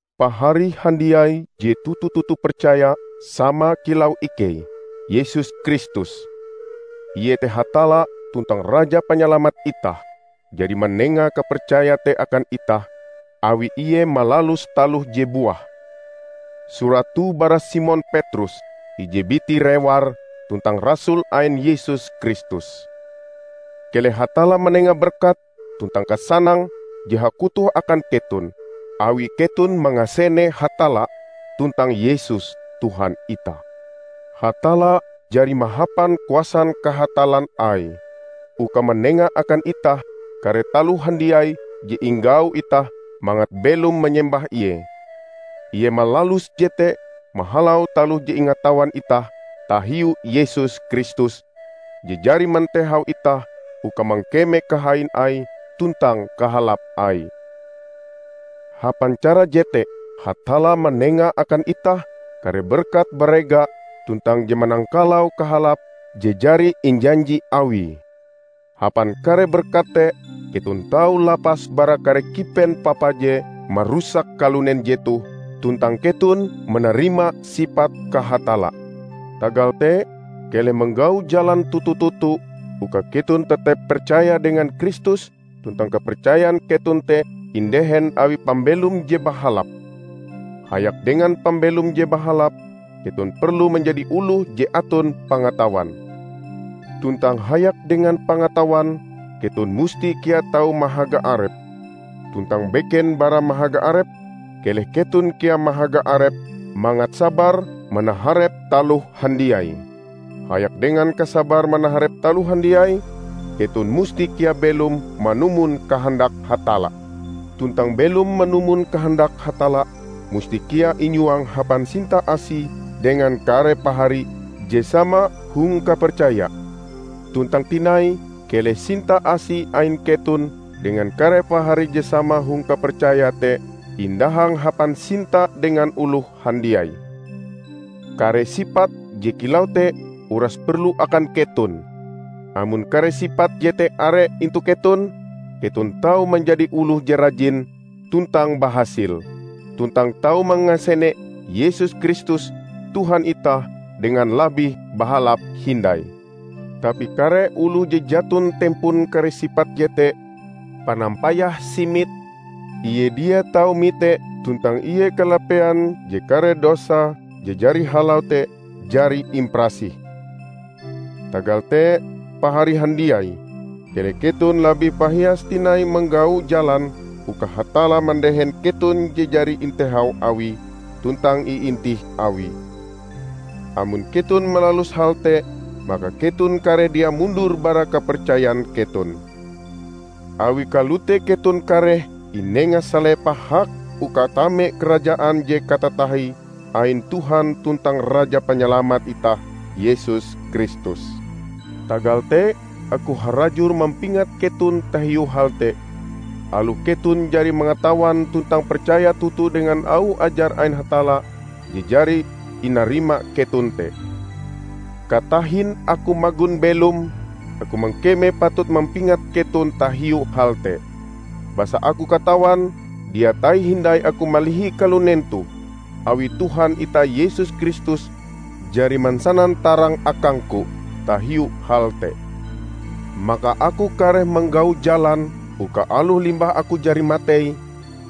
Pahari handiai je toto-toto percaya sama kilau ikei! Yesus Kristus, iete Hatalla tuntang Raja Panyalamat itah, jari manenga kapercaya te akan itah, awi Ie malalus taloh je buah. Surat toh bara Simon Petrus, ije biti rewar tuntang rasul ain Yesus Kristus. Keleh Hatalla manenga berkat tuntang kasanang je hakutoh akan keton, awi keton mangasene Hatalla tuntang Yesus, Tuhan itah. Hatalla jari mahapan kuasan kahatallan Aie uka manenga akan itah kare taloh handiai je inggau itah mangat belom manyembah Ie. Ie malalus jete mahalau taloh je ingatawan itah tahiu Yesus Kristus, je jari mantehau itah uka mangkeme kahain Aie tuntang kahalap Aie. Hapan cara jete Hatalla manenga akan itah kare berkat barega tuntang je manangkalau kahalape je jari injanji Awie. Hapan kare berkat te keton tau lapas bara kare kipen papa je marusak kalunen jetoh, tuntang keton manarima sipat kahatalla. Tagal te, keleh manggau jalan toto-toto uka keton tetep percaya dengan Kristus tuntang kapercayan keton te indehen awi pambelom je bahalap. Hayak dengan pambelom je bahalap, keton perlu manjadi oloh je aton pangatawan, tuntang hayak dengan pangatawan, keton musti kea tau mahaga arep. Tuntang beken bara mahaga arep keleh keton kea mahaga arep mangat sabar manaharep taloh handiai. Hayak dengan kasabar manaharep taloh handiai, keton musti kea belom manumon kahandak Hatalla. Tuntang belom manumon kahandak Hatalla musti kea inyuang hapan sinta asi dengan kare pahari je sama hong kapercaya. Tuntang tinai keleh sinta asi ain keton dengan kare pahari je sama hong kapercaya te indahang hapan sinta dengan oloh handiai. Kare sipat je kilau te uras perlu akan keton. Amon kare sipat jete are intu keton, keton tau manjadi oloh je rajin tuntang bahasil, tuntang tau mangasene Yesus Kristus Tuhan itah dengan labih bahalap hindai. Tapi kare oloh je jaton tempon kare sipat jete, panampayahe simit; ie dia tau mite tuntang ie kalapean je kare dosae je jari halau te jari imparasih. Tagal te, pahari handiai, keleh keton labih pahias tinai manggau jalan uka Hatalla mandehen keton je jari intehau Awie tuntang iintih Awie. Amon keton malalus hal te, maka keton kareh dia mundur bara kapercayan keton. Awi kalote keton kareh inenga salepah hak uka tame Karajaan je katatahie ain Tuhan tuntang Raja Panyalamat itah Yesus Kristus. Tagal te, aku harajur mampingat keton tahiu hal te, aloh keton jari mangatawan tuntang percaya toto dengan auh ajar ain Hatalla je jari inarima keton te. Katahin aku magon belom, aku mangkeme patut mampingat keton tahiu hal te. Basa aku katawan dia tahi hindai aku malihi kalunen toh, awi Tuhan itah Yesus Kristus jari mansanan tarang akangku tahiu hal te. Maka aku kareh manggau jalan uka aloh limbah aku jari matei,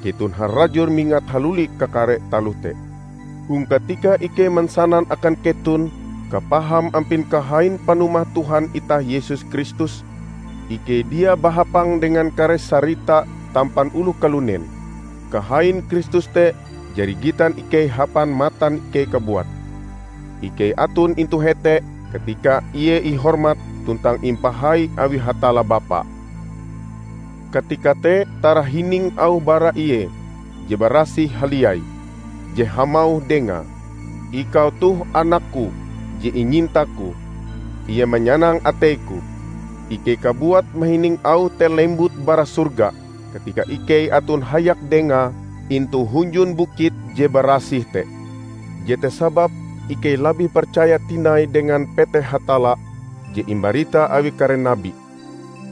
keton harajur mingat haluli kakare taloh te. Hong katika ikei mansanan akan keton kapaham ampin kahain panumah Tuhan itah Yesus Kristus, ikei dia bahapang dengan kare sarita tampan oloh kalunen. Kahain Kristus te jari gitan ikei hapan matan ikei kabuat. Ikei aton intu hete katika ie ihormat tuntang impahai awi Hatalla Bapa. Katika te tarahining auh bara Ie je Barasih Haliai, je hamauh dengae, "Ikau toh anak-Ku je inyinta-Ku. Ie manyanang atei-Ku!" Ikei kabuat mahining auh te lembut bara sorga katika ikei aton hayak dengae intu hunjun bukit je barasih te. Jete sababe ikei labih percaya tinai dengan peteh Hatalla je imbarita awi kare nabi.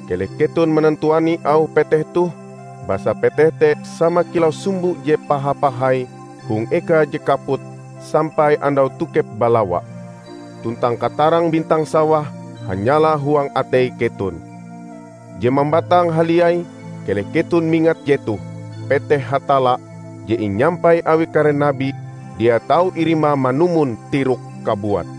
Keleh keton manantuani auh peteh toh, basa peteh te sama kilau sumbo je paha-pahai hong eka je kaput sampai andau tokep balawa, tuntang katarang bintang sawah hanyala huang atei keton. Je mambatang haliai keleh keton mingat jetoh: Peteh Hatalla je inyampai awi kare nabi dia tau irima manumon tirok kabuat.